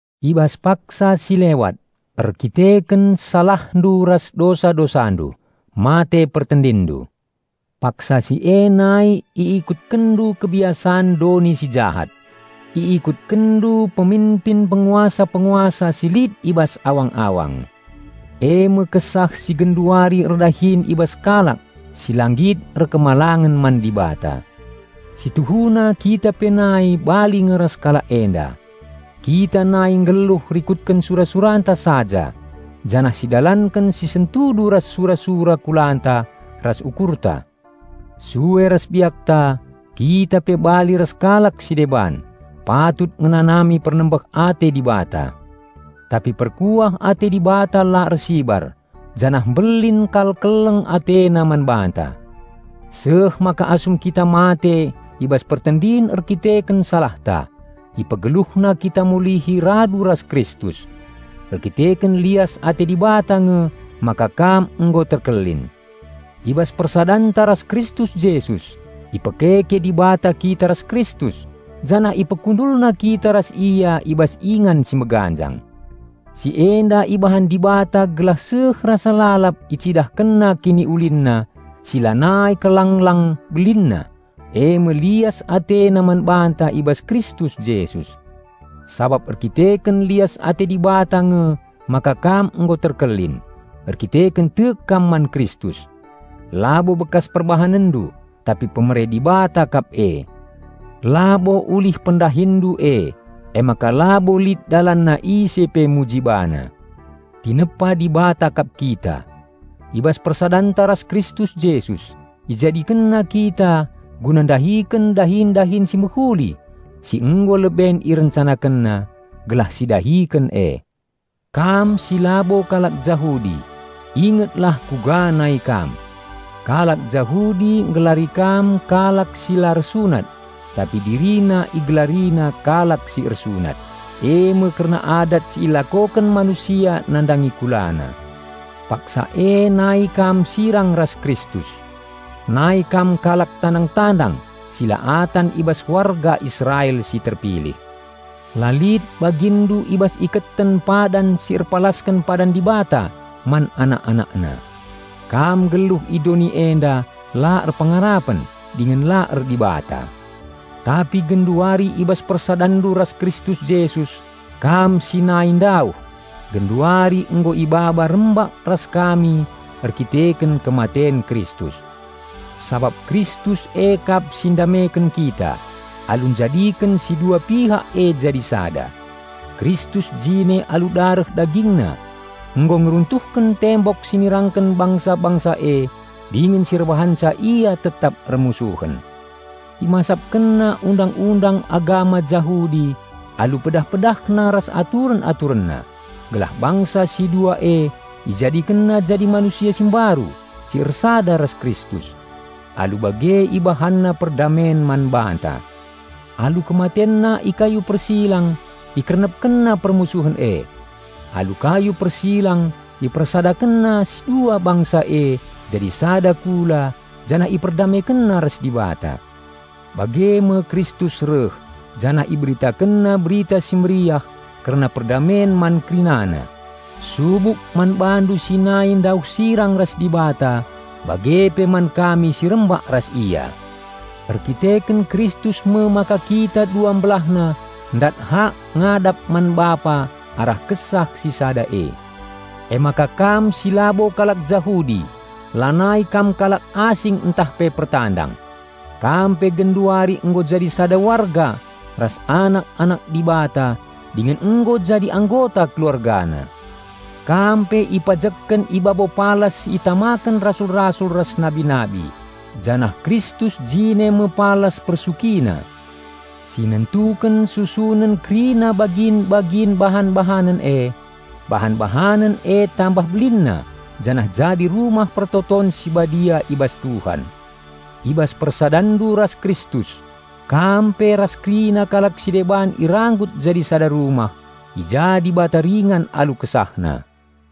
I bas paksa si lewat, erdandanken salahndu ras dosa-dosandu, mate pertendinndu. Paksa si e nai iikutkenndu kebiasan doni si jahat. Iikutkenndu peminpin penguasa-penguasa si lit i bas awang-awang, eme kesah si genduari erdahin i bas kalak si la nggit patuh man Dibata. Si tuhuna kita pe nai bali nge ras kalak enda. Kita nai nggeluh rikutken sura-suranta saja janah sidalanken si sentudu ras sura-sura kulanta ras ukurta. Sue ras biakta, kita pe bali ras kalak si deban, patut ngenanami pernembeh ate Dibata. Tapi perkuah ate Dibata la ersibar, janah mbelin kal keleng AteNa man banta. Seh maka asum kita mate i bas pertendin erdandanken salahta, IpegeluhNa kita mulihi radu ras Kristus. Erdandanken lias ate Dibata nge maka kam nggo terkelin. I bas persadanta ras Kristus Jesus, ipekeke Dibata kita ras Kristus, janah IpekundulNa kita ras Ia i bas ingan si meganjang. Si enda ibahan Dibata gelah seh rasa lalap IcidahkenNa KiniulinNa si lanai kal lang-lang belinna, eme lias AteNa man banta i bas Kristus Jesus. Sabap erdandanken lias ate Dibata nge maka kam nggo terkelin, erkiteken tek kam man Kristus. Labo bekas perbahanenndu, tapi pemere Dibata kap e. Labo ulih pendahinndu e, emaka labo lit dalanna ise pe muji bana. Tinepa Dibata kap kita; i bas persadanta ras Kristus Jesus, IjadikenNa kita guna ndahiken dahin-dahin si mehuli si nggo leben IrencanakenNa, gelah sidahiken e. Kam si labo kalak Jahudi, ingetlah kuga nai kam. Kalak Jahudi nggelari kam kalak si "la ersunat" tapi dirina igelarina kalak si "ersunat" eme kerna adat si ilakoken manusia nandangi kulana. Paksa e nai kam sirang ras Kristus. Nai kam kalak tandang-tandang si la atan i bas warga Israel si terpilih. La lit baginndu i bas iketen padan si erpalasken padan Dibata man anak-AnakNa. Kam nggeluh i doni enda la erpengarapen, dingen la er-Dibata. Tapi genduari i bas persadanndu ras Kristus Jesus, kam si nai ndauh, genduari nggo ibaba rembak ras kami erdandanken kematen Kristus. Sabap Kristus e kap si ndameken kita, alu njadiken si dua pihak e jadi sada. Kristus jine alu dareh DagingNa nggo ngeruntuhken tembok si nirangken bangsa-bangsa e dingen si erbahanca ia tetap ermusuhen. ImasapkenNa Undang-undang agama Jahudi alu pedah-PedahNa ras aturen-AturenNa, gelah bangsa si dua e IjadikenNa jadi manusia si mbaru si ersada ras Kristus. Alu bage IbahanNa perdamen man banta. Alu KematenNa i kayu persilang IkernepkenNa permusuhen e. Alu kayu persilang IpersadakenNa si dua bangsa e jadi sada kula janah IperdamekenNa ras Dibata. Bage me Kristus reh, janah IberitakenNa Berita Si Mehuli kerna perdamen man kerinana, subuk man bandu si nai ndauh sirang ras Dibata bage pe man kami si rembak ras Ia. Erkiteken Kristus me maka kita dua mbelahna ndat hak ngadap man Bapa arah Kesah si Sada e. Emaka kam si labo kalak Jahudi lanai kam kalak asing ntah pe pertandang. Kam pe genduari nggo jadi sada warga ras anak-anak Dibata dingen nggo jadi anggota KeluargaNa. Kam pe ipajekken i babo palas si itamaken rasul-rasul ras nabi-nabi, janah Kristus jine me palas persukina. Si nentuken susunen kerina bagin-bagin bahan-bahanen e. Bahan-bahanen e tambah belinna janah jadi Rumah Pertoton si Badia i bas Tuhan. I bas persadanndu ras Kristus, kam pe ras kerina kalak si deban iranggut jadi sada rumah, i ja Dibata ringan alu KesahNa.